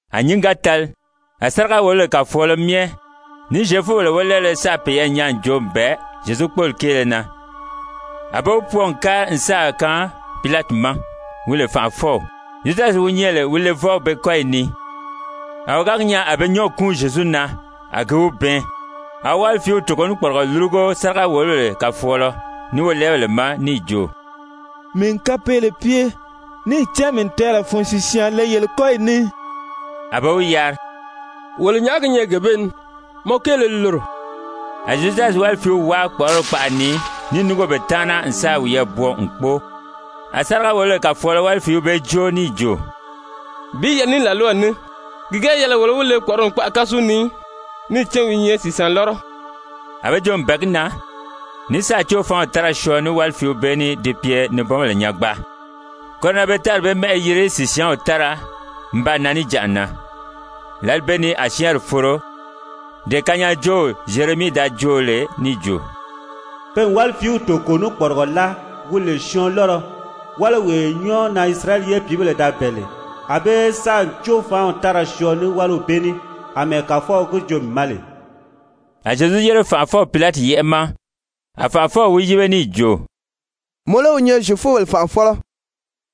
A nyǐngi ga tali a sáriga-wòlobèle kàfɔɔlɔ myɛ ní Zyefubèle wólɛɛbéle sáà peyɛɛ nyaa n joo n bɛ̀ɛ Zyezu kpóoli kéele na. A be wi pwɔɔ n kári n sáà kaan Pilati ma, wi lè fànʔafɔw. Zyudasi wi nyɛ lè Zyezu levɔw be kɔ́yi ni, a wi ga gi nyaa a be nyɔ́ɔgi kúun Zyezu na, a gi wi bɛɛn, a wi wálifiiw toko ní kpɔrigɔ lúrugo sáriga-wòlobèle kàfɔɔlɔ ní wolɛɛbèle ma, níì jo: «Mii n kapeele pye, níì cán mii n tɛɛlɛ fun sìsyaan le yele kɔ́yi ni.» A be wi yari: «Wolo nyàʔá gi nyɛ gee bee ni? Mɔ kéele li loro.» A Zyudasi wálifiiw wáa kpɔ̀ʔɔrɔli kpaʔa ni níì núngo be taana n sáà wiyɛɛ bwɔɔ n kpóo. A sáriga-wòlobèle kàfɔɔlɔ wálifiiw bee jóo níì jo: «Bi yɛlɛ ní làlwaw ní, ki ga yɛlɛ wolo í wi le kpɔ̀ʔɔrɔli kpaʔa kásu ni í, níì cán wi i nyɛ sìsyaan lɔ́rɔ.» A be joo n bɛ̀ɛ gi na, ní sáà cóofaanw tára syɔɔ ní wáliw bee ní di pye nibɔnbèle nyangbaa. Koro na pe tári bee mɛ́ʔɛ yiri Sìsyaanw Tára n baa nan níjanʔa na. Lǎli bee ni a syɛ́ɛnri foro, dee kanyaajoow Zyeremii da joo lè níì jo: «Pe n wálifiiw toko ní kpɔrigɔ láa, wi lè syɔɔn lɔ́rɔ, wáliwee nyɔ́ɔ na Isirayɛli pìíbèle da bɛ̀ɛ lè. A be sáà cóofaanw tára syɔɔ ní wáliw bee ní, àmɛɛ Kàfɔw gi joo mii ma lè.» A Zyezu yére fànʔafɔw Pilati yɛ́ʔɛ ma. A fànʔafɔw wi yíbe níì jo: «Mɔ lé wi nyɛ Zyefubèle fànʔafɔlɔ?»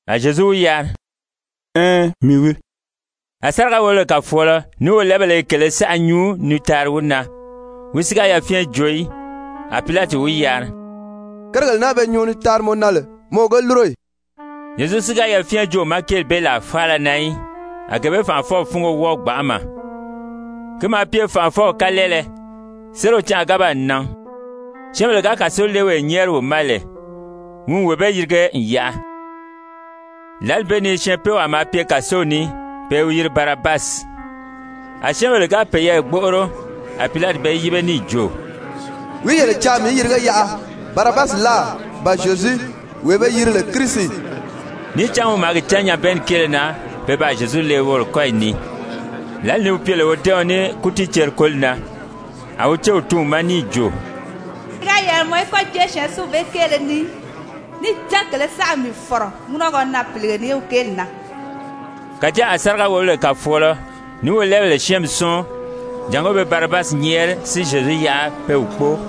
A Zyezu wi yari: «Ɛɛn, mii wii.» A sáriga-wòlobèle kàfɔɔlɔ ní wolɛɛbèle i kèlē saʔa nyuu ni taari wi na, wi si ga yafyɛn joo í. A Pilati wi yari: «Kérigèle naa be nyuu ni taari mɔ na lè, mɔ o ge lúro ì?» Zyezu si ga yafyɛn joo wi ma kéeli bee làa faala na í, a gee bee fànʔafɔw fúngo wɔ́ɔ gbanʔama. Ki maa pye fànʔafɔw kalɛɛlɛ, sériw canʔa ga baa nan, syɛ́ɛnbèle ga kàsolewee nyɛ́ɛri wi ma lè, wi n wee bee yirige n yaʔa. Lǎli bee ni syɛɛnpeewaa maa pye kàsow ni, pe i wi yiri Barabasi. A syɛ́ɛnbèle ga peyɛɛ gbóʔoro, a Pilati be yíbe níì jo: «Wìí yele caa mii í yirige yaʔa, Barabasi láà, ba Zyezu, wee be yiri lè Kirisi Níì cán wi maa gi cán nyabɛɛnni kéele na pe baa Zyezu le woro kɔ́yi ni. Lǎli ni wi pye lè wodɛ́ɛɔn ní kútiiceri-koli na, a wi céw tun wi ma níì jo: «Ki ga yɛlɛ mɔ í kɔ́ jée syɛɛnsinw bee kéele ni í, níì cán kèlē saʔa n mii fɔ̀rɔ ŋúnɔgɔ na pìlige ni wi kéeli na.» Kàjáa a sáriga-wòlobèle kàfɔɔlɔ ní wolɛɛbèle syɛ́ɛnmi sɔ́ɔn jàngó be Barabasi nyɛ́ɛri si Zyezu yaʔa pe wi kpóo.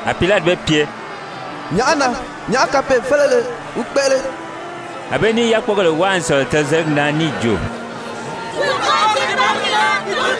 A Pilati be pye: «Nyàʔá na? Nyàʔá kapee-félile wi kpéʔele?» A be ní i yákpogèle wáa n sɔ̀lɔ tɔzeligi na níì jo: «Wi kóri tiiparigi na.»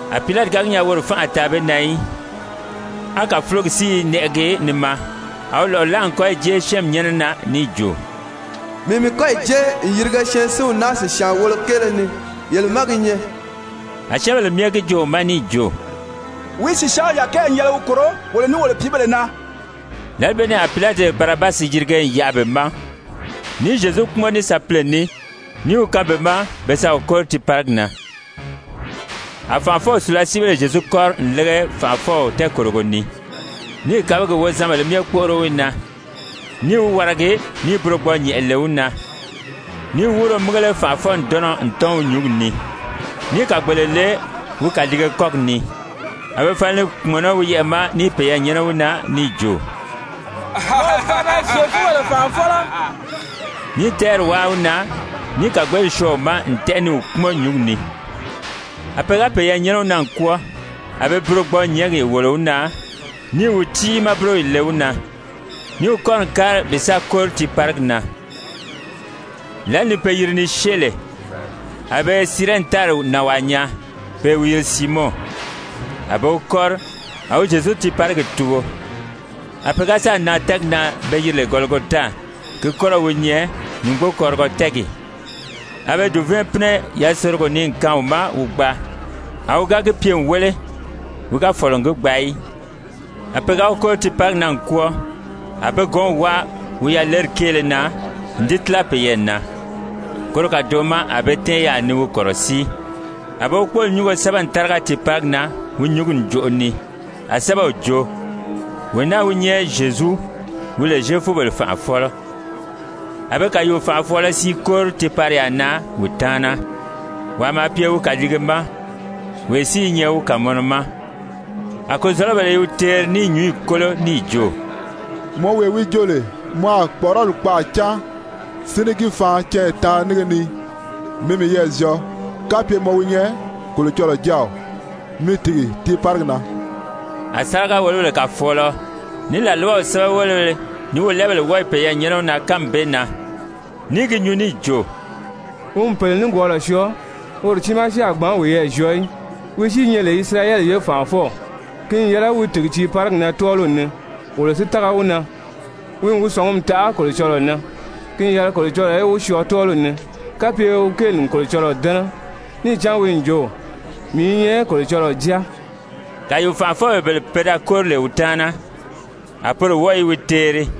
A Pilati ga gi nyaa woro fánʔa a taa be na í, á kàfulogi si i nɛʔɛgi ni maa, a wi lɔ̀ʔɔ láa n kɔ́yi jée syɛ́ɛnmi nyɛ́nɛ na níì jo: «Mii n mii kɔ́yi jée n yirige syɛɛnsinw naa sìsyaan wolo kéele ni. Yele má gi nyɛ.» A syɛ́ɛnbèle myɛ gi joo wi ma níì jo: «Wi sìsyaanw yàkɛɛ n yɛlɛ wi kòro wolo ní wolo pìíbèle na.» Lǎli bee ni a Pilati Barabasi yirige n yaʔa be ma, níì Zyezu kpúmɔn ní sapile ní, níì wi kaan be ma pe sa wi kóri tiiparigi na. A fànʔafɔw sùlasiibéle Zyezu kɔ́ri n lége fànʔafɔw tɛɛkòrogo ni, níì kabigi wozanbèlē myɛ kpóʔoro wi na, níì wi waragi níì burogbɔɔ-nyɛ̀nʔɛ le wi na, níì wúuro mígele fànʔafɔ-ǹdɔnnɔ n tɔ́n wi nyúngi ni, níì kàgbeele le wi kàliige kɔ́gi ni. A be fala ni kpùmɔnɔ wi yɛʔɛ̀ ma ní i peyɛɛ nyɛ́nɛ wi na, níì jo: «Mɔ o faana, Zyefubèle fànʔafɔlɔ!» Ní i tɛ́ɛri wáa wi na níì kàgbeeli syɔɔ wi ma n tɛ́ʔɛ ni wi kpúmɔn nyǔngi ni. A pe ga peyɛɛ nyɛ́nɛ wi na n kwɔ́ɔ, a be burogbɔɔ-nyɛ̀ɛ́ngi wòlo wi na níì wi tiimaa búroyi le wi na, níì wi kɔ́ri n kári bi sa kóri tiiparigi na. Lǎli ni pe yiri ni syée lè, a be Sirɛni tári nànwaa nyaa, pe i wi yiri Siimɔn. A be wi kɔ́ri, a wi Zyezu tiiparigi tugo. A pe ga sáà nan tɛ́ɛgi na be yiri lè Gɔligota, ki kɔ́rɔw wi nyɛ, nyùngbokɔrigɔ tɛ́ɛgi, a be dùvɛɛn pínɛ yasorogo ni n kaan wi ma wi gbaa, a wi ga gi pye n wéle, wi ga fɔ̀lɔ n gi gbaa í. A pe ga wi kóri tiiparigi na n kwɔ́ɔ, a be gɔ̌nw wáa wi yaleri kéele na n di tíla peyɛɛ na. Koro kàdoʔo ma a be tɛ́ɛn yaà ni wi kɔ̀rɔsíi. A be wi kpóoli nyúngo sɛ́bɛ n táriga tiiparigi na wi nyúngi ǹjoʔo ni. A sɛ́bɛw jo: WEE NAA WI NYƐ ZYEZU, WI LE ZYEFUBELE FANʔAFƆLƆ. A be kàyuu-fànʔafɔɔlɔ siin kóri tiipariyaa na wi taana. Wàa maa pye wi kàliige ma, wee si i nyɛ wi kàmɔnɔ ma. A kozɔ̀lɔbèle i wi teeri ní i nyǔnyi kólo, níì jo: «Mɔ wee wi jo lè mɔ a kpɔ̀ʔɔrɔli kpaʔa cáan si ní gi faan canya taanri nínge ni, mi miyɛɛ zyɔɔ. Kapye mɔ wi nyɛ Kolocɔlɔɔ Jáaw, mi tìgi tiiparigi na.» A sáriga-wòlobèle kàfɔɔlɔ, ní làlwaw sɛ́bɛwelebéle, ní wolɛɛbèle wɔ́ɔ i peyɛɛ nyɛ́nɛ wi na kánmi bee na, ní i gi nyuu níì jo: «Wi n pèle nikwɔɔlɔ syɔɔ, woro tiimaa si a gbǎn wiyɛɛ zyɔɔ í! Wi si i nyɛ lè Isirayɛli ye fànʔafɔw, ki n yɛlɛ wi tìgi tiiparigi na tɔ́ɔliw ni, wolo si tága wi na. Wi n wi sɔ̀ngumi taʔa Kolocɔlɔɔ na, ki n yɛlɛ Kolocɔlɔɔ í wi syɔɔ tɔ́ɔliw ni, kapye wi kéeli n Kolocɔlɔɔ dɛ́nɛ. Níì cán wi n jo: ‹Mii i nyɛ Kolocɔlɔɔ Jáa.›» Kàyuu-fànʔafɔbèle bele pe da kóri lè wi taana, a poro wɔ́ɔ i wi teeri.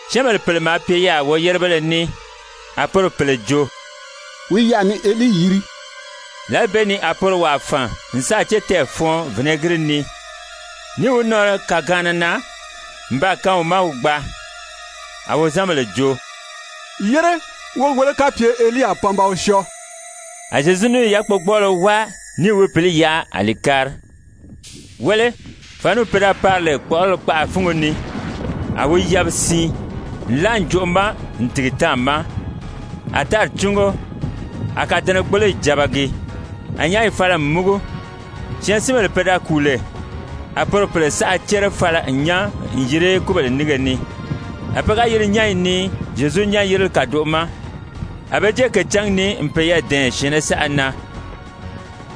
Syɛ́ɛnbèle pèle maa pye yaà woyérebéle ní, a poro pèle jo: «Wi i yaà ni Elii yiri.» Lǎli bee ni a poro wàa fàn n sáà cétɛɛ fɔɔn vinɛgiri ni, níì wi nɔɔri kàgaanna na n baa kaan wi ma wi gbaa. A wozanbèle jo: «Yére, wó gi wéle kapye Elii a pan ba wi syɔɔ.» A Zyezu níì yákpogbɔɔlɔ wáa níì wi pǐli yaʔa a li kári. Wéle, fàniw pe da pari lè kpɔ̀ʔɔrɔli kpaʔa fúngo ni, a wi yabi siin, nlaa ǹjoʔo ma n tìgi táàma, a tári cúngo, a kàdɛnɛgboloyi jabagi. A nyányi fala n múgu, syɛɛnsinbèle pe da kùu lè, a poro pèle saʔa cére fala n nyán n yiri kúbèle nínge ni. A pe ga yiri nyányi ni Zyezu nyán-yirili kàdoʔo ma, a be jée kècǎngi ni n peyɛɛ dɛ̀ɛn syɛ̀ɛnnɛ saʔa na.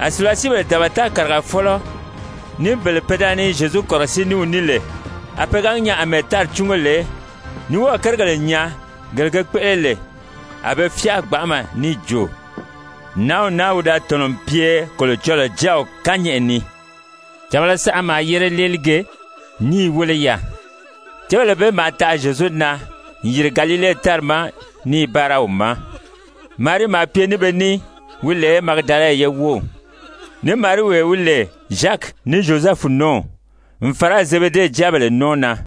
A sùlasiibèle dabata kàrigafɔlɔ ní bele pe da ni Zyezu kɔ̀rɔsíi ní wi ní lè, a pe ga gi nyaa àmɛɛ tári cúngo lè, ní wɔ́ɔ̀ kérigèle nyaa, gele ge kpéʔele lè, a be fyáa gbanʔama níì jo: «Nǎnw naa wi da tɔ̀nɔ n pye Kolocɔlɔɔ Jáaw kányɛʔɛ ni.» Càbala saʔa maa yére léelige, ní i wéle yaà. Cébèle bee maa taʔa Zyezu na n yìri Galile tári ma ní i báara wi ma. Marii maa pye ní be ní wi lè Magidala ye wów, ní Mariiwee ní wi lè Zyaki ní Zyozɛfu nɔ́ɔw, n fàra Zebede jáabèle nɔ́ɔ na.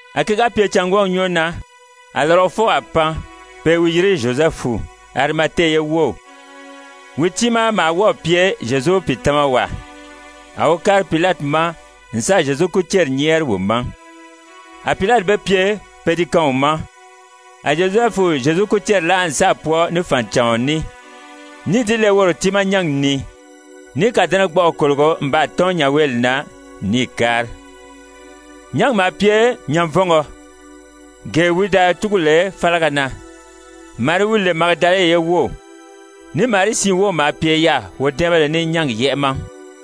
A ki ga pye cângwɔɔgi nyɔ́ɔ na, a lɔrɔfɔwaa pan, pe i wi yiri Zyozɛfu, Arimate ye wów, wi tiimaa maa wɔ́ɔ̀ pye Zyezu pìitamawaa. A wi kári Pilati ma n sáà Zyezu kúceri nyɛ́ɛri wi ma. A Pilati be pye pe di kaan wi ma. A Zyozɛfu Zyezu kúceri láa n sáà pwɔɔ ní fànicàɔn ní, níì di le woro tiimaa nyángi ni, níì kàdɛnɛgbɔʔɔ kòlogo n baa tɔ́n nyanweeli na, níì kári. Nyángi maa pye nyanvɔngɔ, gee wi da túgu lè fálaga na. Marii wi lè Magidala ye wów, ní Marii siin wów maa pye yaà wodɛ́ɛnbéle ní nyángi yɛ́ʔɛ ma.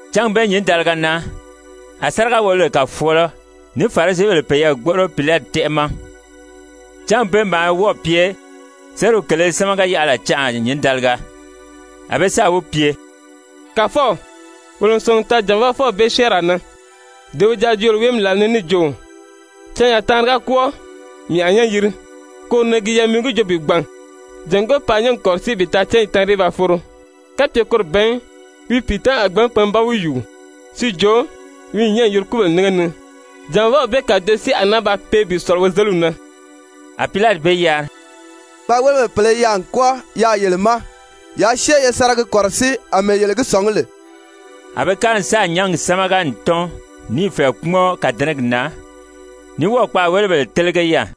Cángi bee nyǐndaliga na, a sáriga-wòlobèle kàfɔɔlɔFarisibèle peyɛɛ gbóʔoro Pilati tɛ́ʔɛ ma, cángi bee maa wɔ́ɔ̀ pye sériw kèlē sámaga-yaʔala canʔa nyǐndaliga. A be sáà wi pye: «Kàfɔw, wolo n sɔ̀ngi n taa jànvaafɔw bee syɛ́ɛnraa na, dee wi da joo lè wi wéemi làla ni níì jo: ‹Canya taanri ga kwɔ́ɔ, mii a nyán yiri.› Koro na gi yɛlɛ mɔ í gi joo bi gbàn, jàngó paa nyángi kɔ̀rɔsíi bi taa cányi taanri í ba foro. Kapye koro ban í, wi pìitamabèle a gbǎn pan ba wi yùu, si jo, wi n nyán n yiri kúbèle nínge ni. Jànvaaw bee kàdoʔo si a naa ba pee bi sɔ̀lɔ wozeliw na.» A Pilati be yari: «Kpaàwelebèle pèle i yaà n kwɔ́ɔ yaà yele ma, yaa syée ye sa ra gi kɔ̀rɔsíi àmɛɛ yele gi sɔ̀ngí lè.» A be kári n sáà nyángi sámaga n tɔ́n níì fɛ̀ɛ kpúmɔn kàdɛnɛgi na, ní wɔ́ɔ̀ kpaàwelebèle télege yaà.